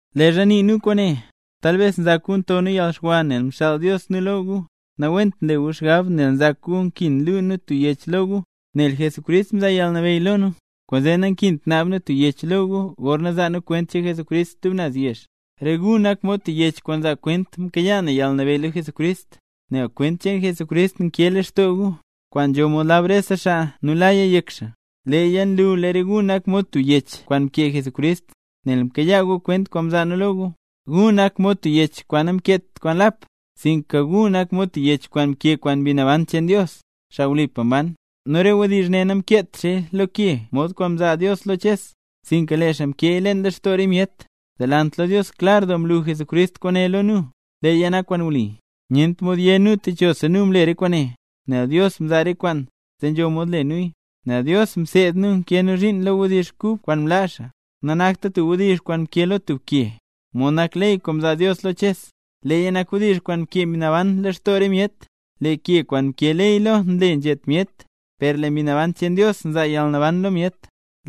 Leezha nii nu kwaane, talbes nzak gu nto nu yalxwa nel mxaal Dios nu lo gu. Nawent nle gu xgab nel nzak gu nkin luu nu tub yech lo gu, nel Jesucrist mzaa yalnabeyy lo nu, kwaanzee nankint naab nu tub yech lo gu gorna zaa nu kwent cheen Jesucrist stub naz yezh. Re gu nak mod tub yech kwaan nzaa kwent mkayaa na yalnabeyy lo Jesucrist; nel kwent cheen Jesucrist nkee lextoo gu, kwaan nzho mod lab rese xaa nu laya yek xaa. Leeya nlu lee re gu nak mod tub yech kwaan mkee Jesucrist, nel mkayaa gu kwent kwaan mzaa nu lo gu. Gu nak mod tub yech kwaan namkeet kwaan lap, sinka gu nak mod tub yech kwaan mkee kwaan Mbi Naban cheen Dios, xaa wlipa mban; nu re wdizh ne namkeet xaaya lo ke mod kwaan mzaa Dios lo Ches, sinka lee xaa mkeeya leen lextoo re myet. Delant lo Dios klar doo mlu Jesucrist kwaane lo nu, leeya nak kwaan wli. Nyent mod yé nu techosa nu mle re kwaane, nel Dios nzaa re kwaan, zee nzho mod le nuya. Nel Dios mseed nu nkee nu zhiin lo wdizh kub kwaan mlaa xaa. Nanakta tub wdizh kwaan mkee lo tub ke, mod nak ley kwaan mzaa Dios lo Ches; leeya nak wdizh kwaan mkee Mbi Naban leen lextoo re myet. Lee ke kwaan mkee ley lo nle nzhet myet, per lee Mbi Naban cheen Dios nzaa yalnaban lo myet.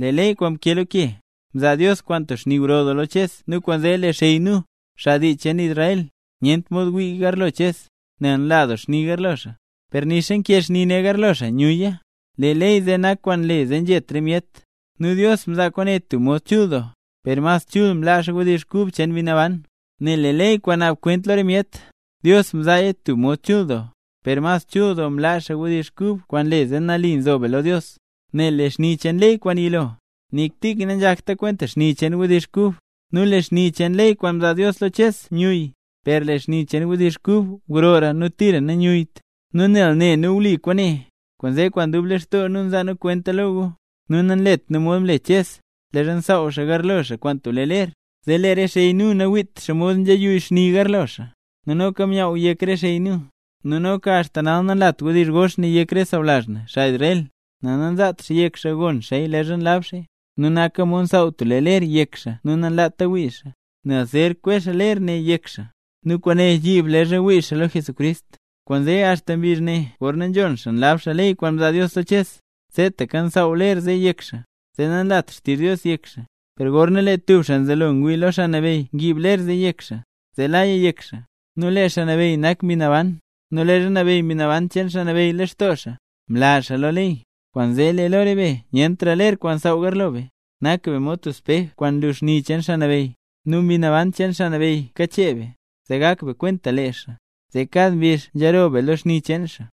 Lee ley kwaan mkee lo ke, mzaa Dios kwaan tub xni gro doo lo Ches nu kwaanzee lee xey nu, xaa dii cheen Israel, nyent mod wii garlo Ches, nel nla doo xni garlo xaa. Per nixa nkee xni ne garlo xaa nyuyya. Lee ley zee nak kwaan nle zee nzhet re myet. Nu Dios mzaa kwaane tub mod chul doo, per mas chul mlaa xaa wdizh kub cheen Mbi Naban. Nel lee ley kwaan naab kwent lo re myet, Dios mzaaya tub mod chul doo, ¡per mas chul doo mlaa xaa wdizh kub kwaan nle zee nali nzo be lo Dios! Nel lee xni cheen ley kwaan yilo, nik tik nanzhakta kwenta xni cheen wdizh kub. Nu lee xni cheen ley kwaan mzaa Dios lo Ches myuyy, per lee xni cheen wdizh kub grora nu tira nanyuyyt. Nu nel ne nu wli kwaane, kwaanzee kwaan dub lextoo nu nzaa nu kwenta lo gu. Nu nanlet nu mod mle Ches, leezha msaaw xaa garlo xaa kwaan tub lee ler, zee lee re xey nu nawiit xomod nzheyuyy xni garlo xaa. Nu noka myaww yek re xey nu. Nu nixa axta nal nanlat wdizh gox ne yek re sawlazh na, xaa Israel, nel nanzaat xaa yek xaa gon xaaya leezha nlab xaaya. Nu naka mod nsaaw tub lee ler yek xaa nu nanlaata wii xaa, nel zer kwe xaa ler ne yek xaa; nu kwaane yiib leezha wii xaa lo Jesucrist. Kwaanzee axta mbizh ne gorna nzhon xaa nlab xaa ley kwaan mzaa Dios lo Ches, seetaka nsaaw ler zee yek xaa, zee nanlat xtizh Dios yek xaa. Per gorna lee tub xaa nzelo ngwii lo Xaa Nabeyy ngiib ler zee yek xaa, zee laya yek xaa. Nu lee Xaa Nabeyy nak Mbi Naban; nu leezha nabeyy Mbi Naban cheen Xaa Nabeyy lextoo xaa, mla xaa lo ley. Kwaanzee lee lo re be nyentra ler kwaan nsaaw garlo be, nak be mod tub spej kwaan nlu xni cheen Xaa Nabeyy, nu Mbi Naban cheen Xaa Nabeyy kachee be, zee gak be kwenta lee xaa, zee kad mbizh nzhiroo be lo xni cheen xaa.